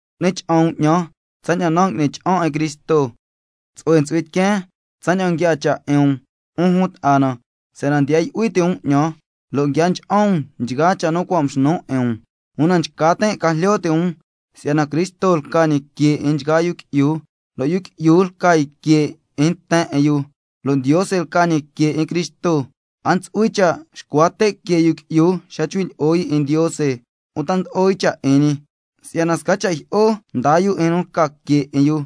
Cu'ni cha'an um 'ñan tsaña'an nan' ngui'nin cha'an 'in Cristo. Tsu'hue ntsu'hui tiqueen tsaña'an nguiaa cha' 'in um, 'un jun ta'a na, si'yana ndiya yu'hui ti' um 'ñan, lo' nguia ncha'an um nchgaa cha' nu cua' mxnun 'in um. Una nchca tin' ca jlyo ti' um si'yana Cristo lca ñi que 'in nchgaa yu qui'yu, lo' yu qui'yu lca yu que 'in nten 'in yu, lo' Ndiose lca ñi que 'in Cristo. A ntsu'hui cha' xcua te' que yu qui'yu lja nchcui' lyi'o yu 'in Ndiose uta ndlo'o yu cha' 'in ñi, si'yana sca cha' jyi'o ndaa yu 'in nu lca que 'in yu.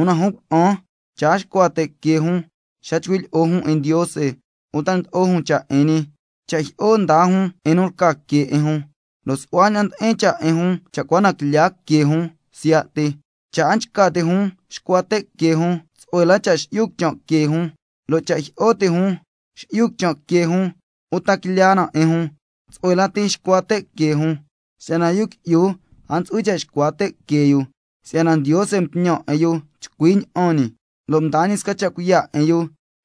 Una jun cuna'an, cha' a xcua te' que jun xa nchcui' lyi'o jun 'in Ndiose uta ndlo'o jun cha' 'in ñi, cha' jyi'o ndaa jun 'in nu lca que 'in jun, lo' su'hua ña'an ndi'in cha' 'in jun cha' cua na ngulya que jun siya' ti. Cha' a nchca ti' jun xcua te' que jun, tsu'hue lati xi'yu quichan' que jun, lo' cha' jyi'o ti' jun xi'yu quichan' que jun uta quilya na 'in jun, tsu'hue lati xcua te' que jun. Si'yana yu qui'yu a ntsu'hui cha' xcua te' que yu, si'yana Ndiose mtñan 'in yu chcui ña'an ñi, lo' mdaa ñi sca cha' cuiya' 'in yu,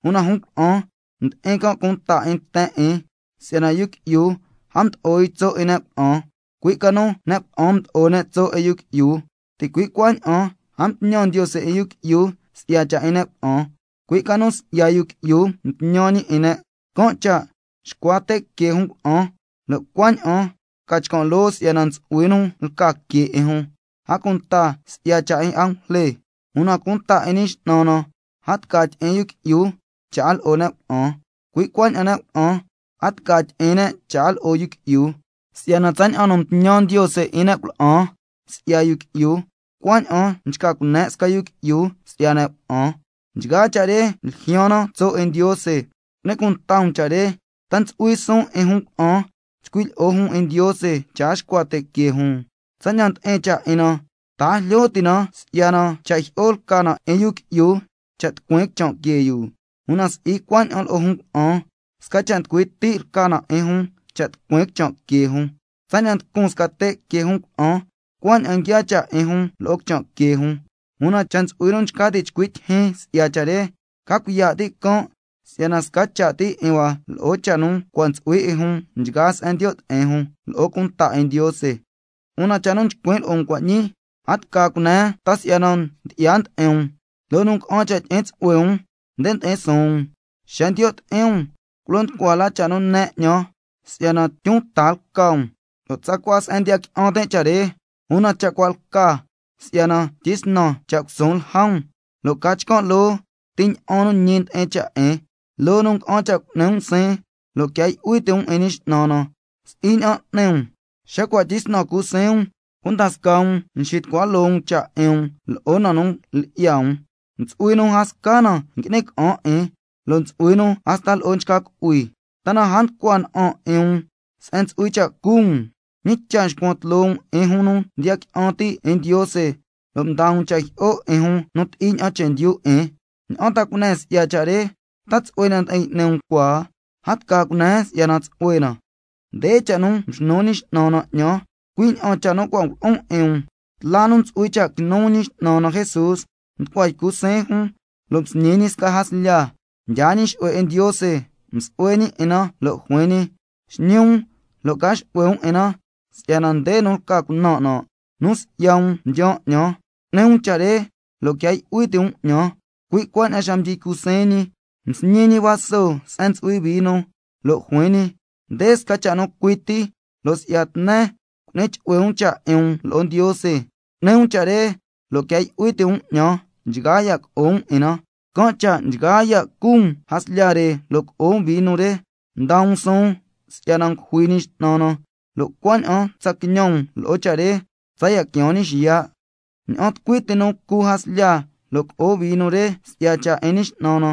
una jun cuna'an ndi'in can' cunta 'in nten 'in. Si'yana yu qui'yu a mdo'o yu tso' 'in ne' cuna'an, cui' ca nu ne' cuna'an mdo'o ne' tso' 'in yu qui'yu, ticui' cuaña'an a mtñan Ndiose 'in yu qui'yu si'ya cha' 'in ne' cuna'an, cui' ca nu si'ya yu qui'yu mtñan ñi 'in ne'. Can' cha' xcua te' que jun cuna'an, lo' cuaña'an ca chcan' loo si'yana ntsu'hui nu lca que 'in jun, a cunta si'ya cha' 'in angujle. Una cunta 'in Ñi X'nan na, a tca tyi'in yu qui'yu cha' a lo'o ne' cuna'an, cuaña'an ne' cuna'an, a tca tyi'in ne' cha' a lo'o yu qui'yu, si'yana tsaña'an nu mtñan Ndiose 'in ne' cuna'an si'ya yu qui'yu, cuaña'an nchca cune' sca yu qui'yu si'ya ne' cuna'an. Nchgaa cha' re ljyaan na tso' 'in Ndiose. Cu'ni cunta um cha' re: ¿Ta ntsu'hui suun 'in jun cuna'an chcui' lyi'o jun 'in Ndiose cha' a xcua te' que jun? Tsaña'an ndi'in cha' 'in na, ¿ta a jlyo ti' na si'yana cha' jyi'o lca na 'in yu qui'yu cha' tucuin quichan' que yu? Una si'i cuaña'an lo'o jun cuna'an, sca cha' nducui ti' lca na 'in jun cha' tucuin quichan' que jun, tsaña'an nducun sca te' que jun cuna'an cuaña'an nguiaa cha' 'in jun lo'o quichan' que jun. Una cha' ntsu'hui nu nchca ti' chcui' tyijyin si'ya cha' re, ca cuiya' ti' can' si'yana sca cha' ti 'in hua lo'o cha' nu cua' ntsu'hui 'in jun, scasca se'en ndiyo' ti'in jun lo'o cunta 'in Ndiose. Una cha' nu chcuin' lo'o um cua' ñii a tca cunen si'yana ndyi'ya ndi'in um, si'yana loo nu nga'an cha' tyi'in tsu'hue um, nde ndi'in suun um. Xa ndiyo' ti'in um, culo nducua la cha' nu nen 'ñan si'yana tyun ta lca um, lo' tsacua se'en ndiya qui'an tin' cha' re. Una cha' cua' lca si'yana tyisnan cha' cusuun lja um, lo' ca chcan' loo ti ña'an nu ñi ndi'in cha' 'in. Loo nu nga'an cha' cu'ni um siin si'yana quia yu'hui ti' um 'in Ñi X'nan na, si'i ña'an n'ni um, xa cua' tyisnan cu siin um, cunda scaa um nxitucua loo um cha' 'in um lo'o na nu lyi'ya um, ntsu'hui nu a sca na ngui'ni ca'an 'in, lo' ntsu'hui nu hasta lo'o nchca cu'hui. ¿Ta na a nducua na'an 'in um se'en ntsu'hui cha' cu um? ¿Ñi cha' nxcuan tloo um 'in jun nu ndiya qui'an ti' 'in Ndiose lo' mdaa um cha' jyi'o 'in jun nu ti'i ña'an chendyu 'in? ¿Ña'an ta cunen si'ya cha' re? ¿Ta tsu'hue ña'an ndi'in y'ni um cua? A tca cunen si'yana tsu'hue na. Nde cha' nu mxnu Ñi X'nan na 'ñan, cui' ña'an cha' nu cua' ngulo'on 'in um: Tla nu ntsu'hui cha' quinu Ñi X'nan na Jesús, nducua ycu siin jun, lo' msñi ñi sca jaslya, mdyaa ñi xu'hue 'in Ndiose, msu'hue ñi 'in na, lo' juin ñi: Xñi um lo' ca xu'hue um 'in na, si'yana nde nu lca cunan' nan', nu si'ya um mdyaan 'ñan, cu'ni um cha' re lo' quia yu'hui ti' um 'ñan. Cui' cuaña'an xa mdyi ycu siin ñi, msñi ñi vaso se'en ntsu'hui vino, lo' juin ñi: Nde sca cha' nu cui ti lo' si'ya tnen cu'ni chu'hue um cha' 'in um lo'o Ndiose. Cu'ni um cha' re lo' quia yu'hui ti' um 'ñan nchgaa ya' co'o um 'in na. Can' cha' nchgaa ya' cu um jaslya re lo' co'o um vino re, ndaa um suun si'yana ngujui Ñi X'nan na, lo' cuaña'an tsa quiñan um lo'o cha' re tsaya' quiaan ñi xiya'. Ña'an tucui ti nu cu jaslya lo' co'o vino re, si'ya cha' 'in Ñi X'nan na,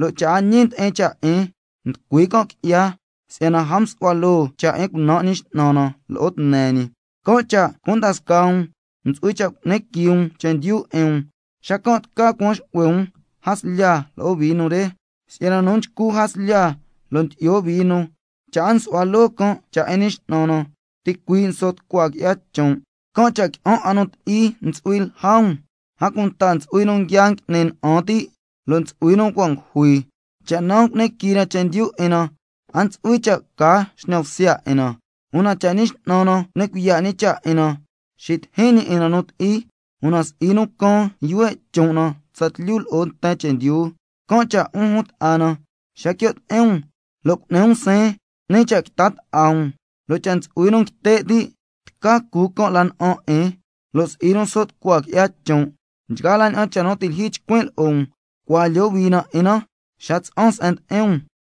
lo' cha' a ñi ndi'in cha' 'in, nducui can' qui'ya si'yana a msu'hua loo cha' 'in cunan' Ñi X'nan na lo'o tne ñi. Can' cha' cunda scaa um ntsu'hui cha' cu'ni quii um chendyu 'in um, xacan' tca cuan xu'hue um jaslya lo'o vino re. Si'yana nu nchcu jaslya lo' ndyi'yo vino, cha' a nsu'hua loo can' cha' 'in Ñi X'nan na, ticuii' nso' tucua qui'ya chon'. Can' cha' qui'an 'a nu ti'i ntsu'hui lja um, a cunta ntsu'hui nu nguia ngui'ni na'an ti', lo' ntsu'hui nu cua' ngujui. Cha' naa cu'ni quii na chendyu 'in na, a ntsu'hui cha' ca xñan bsya 'in na, una cha' Ñi X'nan na cu'ni cuiya' ñi cha' 'in na, xitijin ñi 'in na nu ti'i, una si'i nu caan yuhue' chon' na tsatlyu lo'o nten chendyu. Can' cha' 'un jun ta'a na, xa quio' ti'in um lo' cu'ni um siin, 'ni cha' quita ta'a um. Lo' cha' ntsu'hui nu nguite' ti', tca cu can' la na'an 'in, lo' si'i nu so' tucua qui'ya chon'. Nchgaa la ña'an cha' nu ti' lyijyi chcuin' lo'o um, cua lyohui na 'in na xa tsa'an se'en ndi'in um.